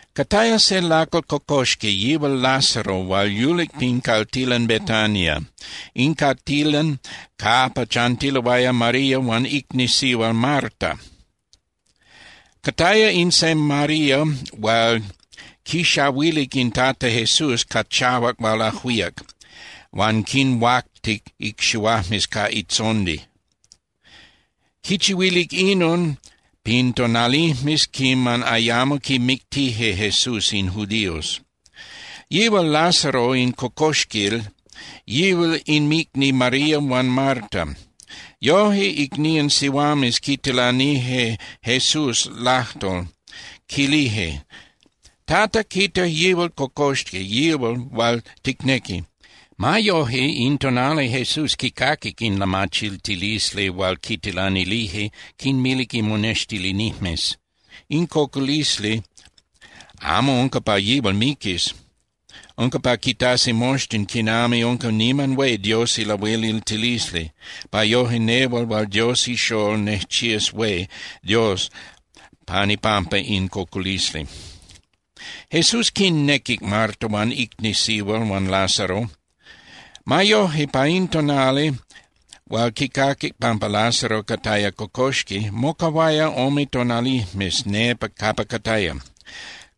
Cataya se lacal cocoxqui, yihual Lázaro hual yulic pin caltilan Betania, in caltilan capa chantiloaya María huan icni sihual Marta. Cataya in se María hual quixahuilic in Tata Jesús ca chahuac hual ajuíac, huan quinhuactic icxihuajmes ca itzondi. Quichihuilic inon pin tonalijmes quiman ayamo quimictije Jesús in judíos. Yihual Lázaro in cocoxquil, yihual inmicni María huan Marta. Yoje, icnían sihuames quitilanilije Jesús lajtol, quilije: —Tata, quita, yihual cocoxqui, yihual hual ticnequi. Ma yoje, in tonali Jesús quicaquic in lamachiltilisli hual quitilanilije, quinmilic imonextilinijmes: —In cocolisli amo unca pa yihual miquis. Unca pa quitasi moxtin quinami unca niman hué Dios ilahueliltilisli, pa yoje nehual hual Dios iXól nejchías hué Dios pan ipampa in cocolisli. Jesús quinnequic Marta huan icni sihual huan Lázaro. Ma yoje, pa in tonali hual quicaquic pampa Lázaro cataya cocoxqui, mocahuaya ome tonalijmes nepa capa cataya.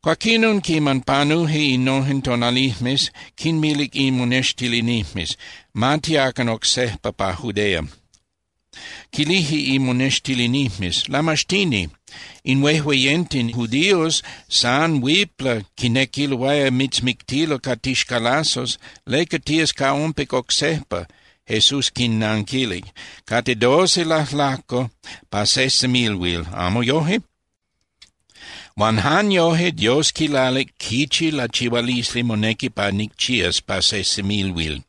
Cuaquinon, quiman panuje innojen tonalijmes, quinmilic imonextilinijmes: —Ma tiacan oc sejpa pa Judea. Quilije imonextilinijmes: —Lamaxtini, in huejueyenten judíos san huipla quinequiloaya mitzmictilo ca tixcalazos. ¿Leca tías ca ompic oc sejpa? Jesús quinnanquilic: —Cate doce lajlajco pa se semilhuil, ¿amo yoje? Huan jan yoje Dios quilalic quichi lachihualisli monequi pa nicchías pa se semilhuil.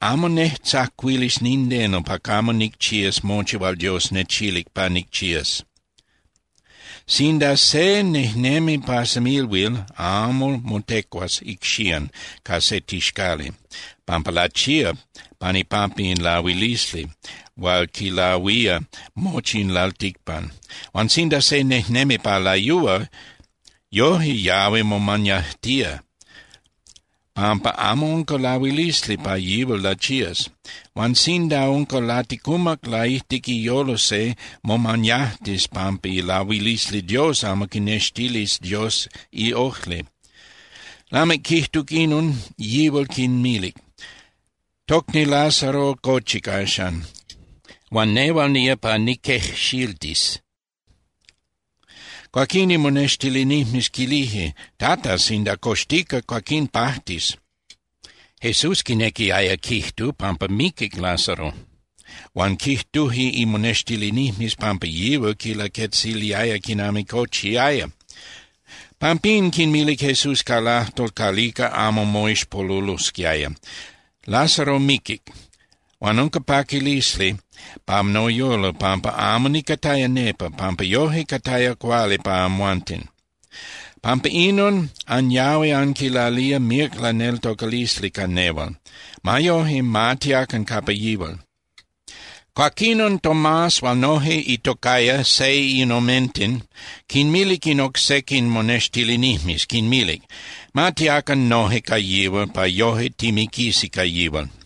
Amo nejtzacuilis nindeno pa camo nicchías mochi hual Dios nechilic pa nicchías. Sinda se nejnemi pa semilhuil, amo motecuas icxían ca se tixcali, pampa lachía pan ipampa in lahuilisli hual quilahuía mochi in lalticpan. Huan sinda se nejnemi pa layúa, yoje yahui momañajtía, pampa amo unca lahuilisli pa yihual lachías. Huan sinda unca laticumac laijtic iyolo se, momañajtis pampa ilahuilisli Dios amo quinextilis Dios iojli. Lamic quijtuc inon, yihual quinmilic: —Tocni Lázaro cochic axan. Huan nehual nía pa niquejxiltis. Cuaquín imonextilinijmes quilije: —Tata, sinda coxtica, cuaquín pajtis. Jesús quinequiaya quijtu pampa miquic Lázaro. Huan quijtuje imonextilinijmes pampa yihual quinlaquetziliaya quinami cochiaya. Pampín, quinmilic Jesús ca lajtol calica amo moixpolulosquiaya: —Lázaro miquic. Huan unca paquilisli pa noyolo pampa amo nicataya nepa, pampa yoje cataya cuali pa amhuanten. Pampa inon, anyahui anquilalía míac laneltocalisli ca nehual. Ma yoje, ma tiacan capa yihual. Cuaquinon Tomás hual noje itocaya Seinomenten quinmilic in oc sequin monextilinijmes, quinmilic: —Ma tiacan noje ca yihual, pa yoje timiquisi ca yihual.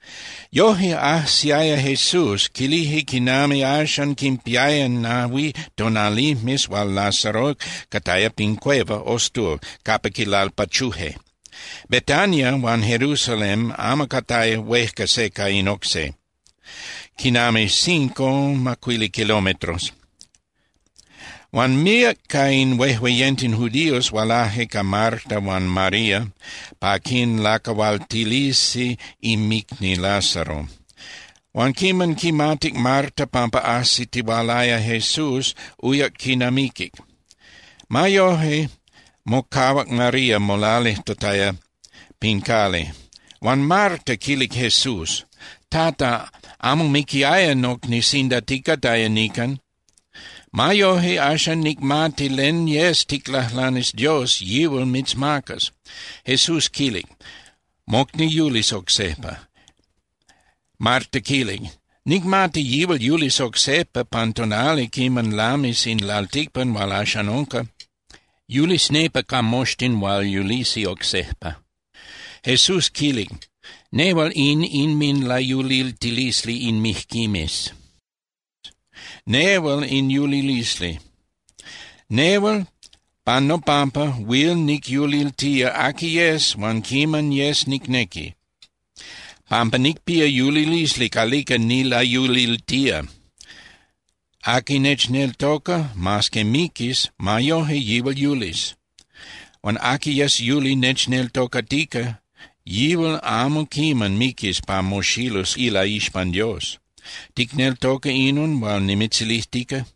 Yoje, ajsiaya Jesús, quilije quinami axan quinpiaya nahui tonalijmes hual Lázaro cataya pin cueva (ostul) capa quilalpachuje. Betania huan Jerusalén amo cate huejca se ca in oc se, quinami cinco (macuili) kilometros. Huan míac ca in huejueyenten judíos hualaje ca Marta huan María pa quinlacahualtilisi inmicni Lázaro. Huan quiman quimatic Marta pampa ajsitihualaya Jesús, uyac quinamiquic. Ma yoje, mocahuac María molalijtataya pin cali. Huan Marta quilic Jesús: —Tata, amo miquiaya nocni sinda ticataya nican. Ma yoje, axan nicmati len yes ticlajlanis Dios, yihual mitzmacas. Jesús quilic: —Mocni yulis oc sejpa. Marta quilic: —Nicmati yihual yulis oc sejpa pan tonali quiman lamis in lalticpan hual axan unca. Yulis nepa ca moxtin hual yulisi oc sejpa. Jesús quilic: —Nehual in inminlayuliltilisli in mijquimes, nehual in yulilisli. Nehual pan nopampa huil nicyuliltía aqui yes huan quiman yes nicnequi, pampa nicpía yulilisli calica nilayuliltía. Aqui nechneltoca, mas que miquis, ma yoje yihual yulis. Huan aqui yes yuli nechneltocatica, yihual amo quiman miquis pa moxilus ilaixpan Dios. ¿Ticneltoca inon hual nimitzilijtica?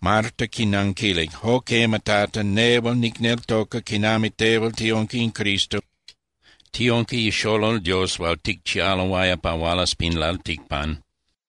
Marta quinanquilic: —Jo quema, Tata, nehual nicneltoca quinami tehual tiunca in Cristo, tiunca iXolol Dios hual ticchialoaya pa hualas pin lalticpan.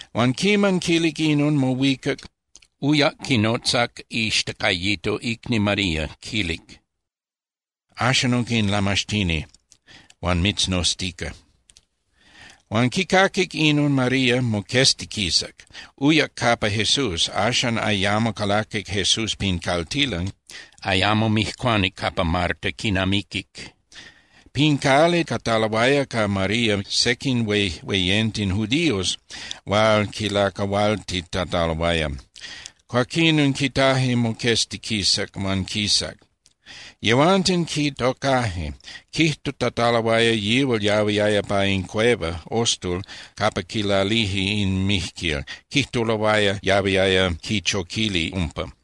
Huan quiman quilic inon, mohuicac, uyac quinotzac ixtacayito icni María, quilic: —Axan unca in Lamaxtini huan mitznoztica. Huan quicaquic inon María, moqueztiquisac, uyac capa Jesús. Axan ayamo calaquic Jesús pin caltilan, ayamo mijcuanic capa Marta quinamiquic. Pin cali cataloaya ca María sequin huejueyenten judíos hual quilacahualtitataloaya. Cuaquinon, quitaje moqueztiquisac huan quisac. Yehuanten quitocaje, quijtutataloaya yihual yahuiaya pa in cueva (ostul) capa quilalije in mijquil. Quijtuloaya yahuiaya quichoquili umpa.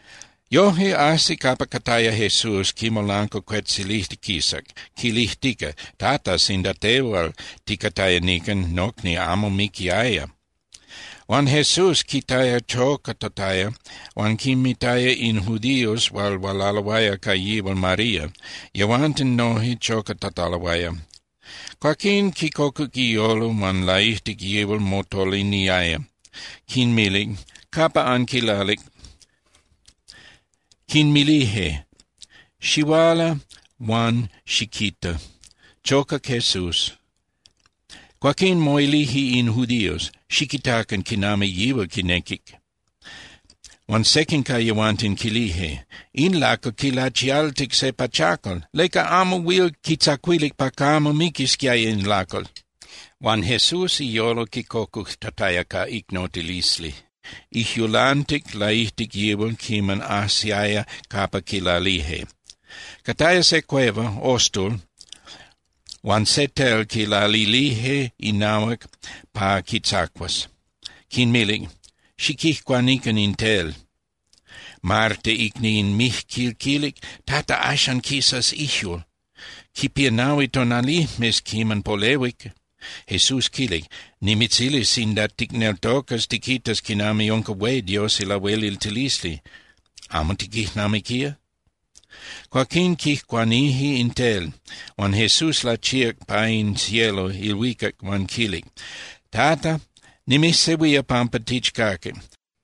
Yoje, ajsic capa cataya Jesús quimolancuacuetzilijtiquisac, quilijtica: —Tata, sinda tehual ticataya nican, nocni amo miquiaya. Huan Jesús quitaya chocatataya huan quinmitaya in judíos hual hualaloaya ca yihual María, yehuanten noje chocatataloaya. Cuaquín quicocuc iyolo huan laijtic yihual motoliniaya. Quinmilic: —¿Capa anquilalic? Quinmilije: —Xihuala huan xiquita. Chocac Jesús. Cuaquín moilije in judíos: —Xiquitacan quinami yihual quinequic. Huan sequin ca yehuanten quilije: —In lacal quilachialtic se pachacal. ¿Leca amo huil quitzacuilic pa camo miquisquiaya in lacal? Huan Jesús iyolo quicocujtataya ca icnotilisli, ijyulantic laijtic yihual quiman ajsiaya capa quilalije. Cataya se cueva (ostul) huan se tel quilalilije inahuac pa quitzacuas. Quinmilic: —Xiquijcuanican in tel. Marta icni in mijquil quilic: —Tata, axan quisas ijyul. Quipía nahui tonalijmes quiman polehuic. Jesús quilic: —Nimitzilic sinda ticneltocas, tiquitas quinami unca hué Dios ilahueliltilisli. ¿Amo tiquijnamiquía? Cuaquín quijcuanije in tel. Huan Jesús lachíac pa in cielo (ilhuicac) huan quilic: —Tata, nimijsehuía pampa tichcaquic.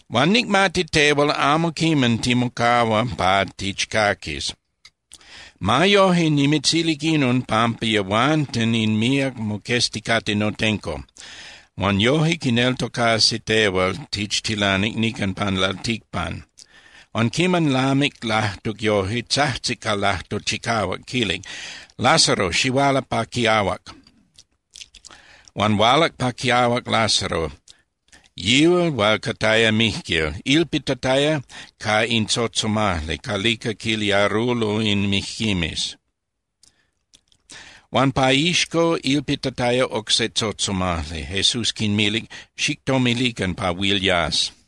Huan nicmati tehual amo quiman timocahua pa tichcaquis. Ma yoje, nimitzilic inon pampa yehuanten in míac moquezticate notenco, huan yoje quineltocasi tehual tichtilanic nican pan lalticpan. Huan quiman lamic lajtuc yoje, tzajtzic ca lajtol chicahuac, quilic: —¡Lázaro, xihuala pa quiahuac! Huan hualac pa quiahuac Lázaro, yihual hual cataya mijquil, ilpitataya ca in tzotzomajli calica quiliarulo in mijquimes, huan pa iixco ilpitataya oc se tzotzomajli. Jesús quinmilic: —Xictomilican pa huil yas.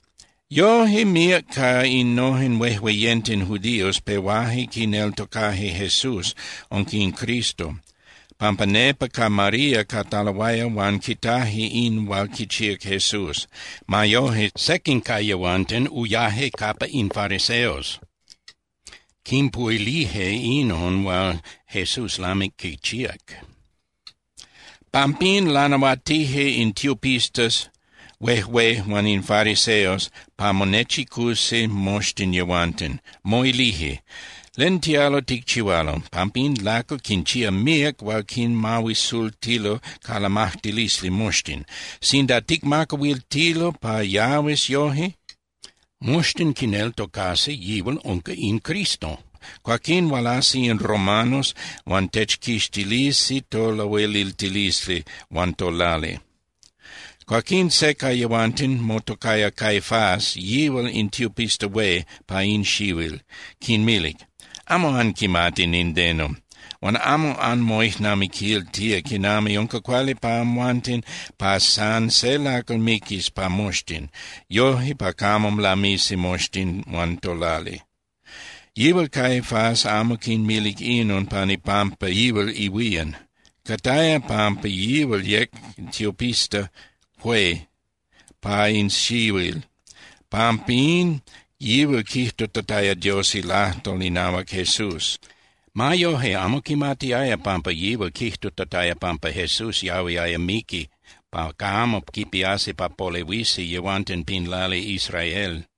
Yoje, míac ca innojen huejueyenten judíos pehuaje quineltocaje Jesús unca in Cristo, pampa nepa ca María cataloaya huan quitaje in hual quichíac Jesús. Ma yoje, sequin ca yehuanten uyaje capa in fariseos, quinpuhuilije inon hual Jesús lamic quichíac. Pampín, lanahuatije in tiopistas huejué huan in fariseos pa monechicusi moxtin yehuanten, moilije: ¿Len tialo ticchihualo? Pampa in lacal quinchía míac hual quinmahuisultilo ca lamajtilisli moxtin. Sinda ticmacahuiltilo pa yahuis yoje, moxtin quineltocasi yihual unca in Cristo. Cuaquín hualasi in romanos huan techquixtilisi tolahueliltilisli huan tolali. Cuaquín se ca yehuanten motocaya Caifás, yihual in tiopista hué pa in xihuil, quinmilic: —Amo anquimati nindeno, huan amo anmoijnamiquiltía quinami unca cuali pa amhuanten pa san se lacal miquis pa moxtin, yoje pa camo lamisi moxtin huan tolali. Yihual Caifás amo quinmilic inon pan ipampa yihual ihuían. Cataya pampa yihual yec tiopista hué pa in xihuil, pampín yihual quijtutataya Dios ilajtol inahuac Jesús. Ma yoje, amo quimatiaya pampa yihual quijtutataya pampa Jesús yahuiaya miqui pa camo quipíasi pa polehuisi yehuanten pin lali Israel.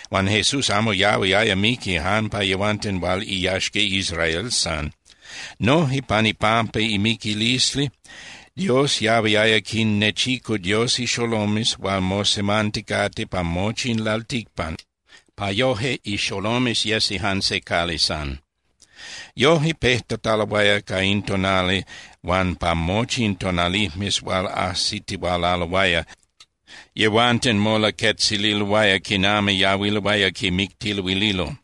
Huan Jesús amo yahuiaya miqui jan pa yehuanten hual iyaxca Israel san. Noje pan ipampa imiquilisli, Dios yahuiaya quinnechicu Dios ixolomes hual mosemanticate pa mochi in lalticpan, pa yoje ixolomes yesi jan se cali san. Yoje, pejtataloaya ca in tonali huan pa mochi in tonalijmes hual ajsitihualaloaya, yehuanten molaquetzililoaya quinami yahuiloaya quimictiluililo.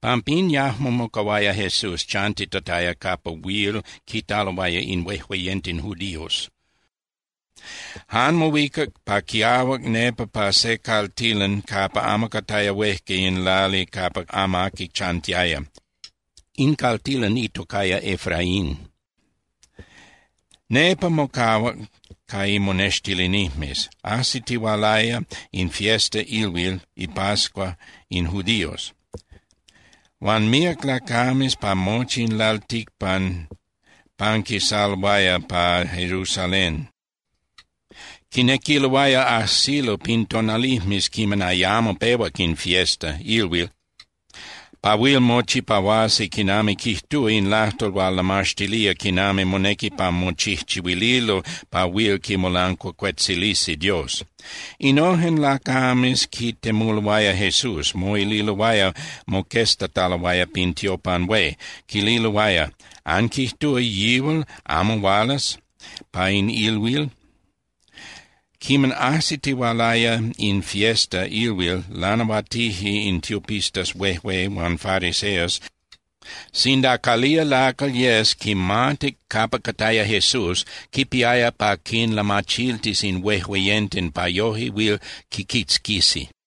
Pampín yajmo mocahuaya Jesús chantitataya capa huil quitaloaya in huejueyenten judíos. Jan mohuicac pa quiahuac nepa pa se caltilan capa amo cataya huejca in lali capa amaqui chantiaya. In caltilan itocaya Efraín. Nepa mocahuac ca imonextilinijmes. Ajsitihualaya in fiesta (ilhuil) ipascua in judíos, huan míac lacames pa mochi in lalticpan panquisaloaya pa Jerusalén, quinequiloaya ajsilo pin tonalijmes quiman ayamo pehuac in fiesta (ilhuil) pa huil mochipahuasi quinami quijtúa in lajtol hual lamaxtilía quinami monequi pa mochijchihuililo pa huil quimolancuacuetzilisi Dios. Innojen lacames quitemuloaya Jesús, moililoaya moqueztataloaya pin tiopan hué, quililoaya: —¿Anquijtúa yihual amo hualas pa in ilhuil? Quiman ajsitihualaya in fiesta (ilhuil), lanahuatije in tiopistas huejué huan fariseos sinda calía lacal yes quimatic capa cataya Jesús, quipiaya pa quinlamachiltis in huejueyenten pa yoje huil quiquitzquisi.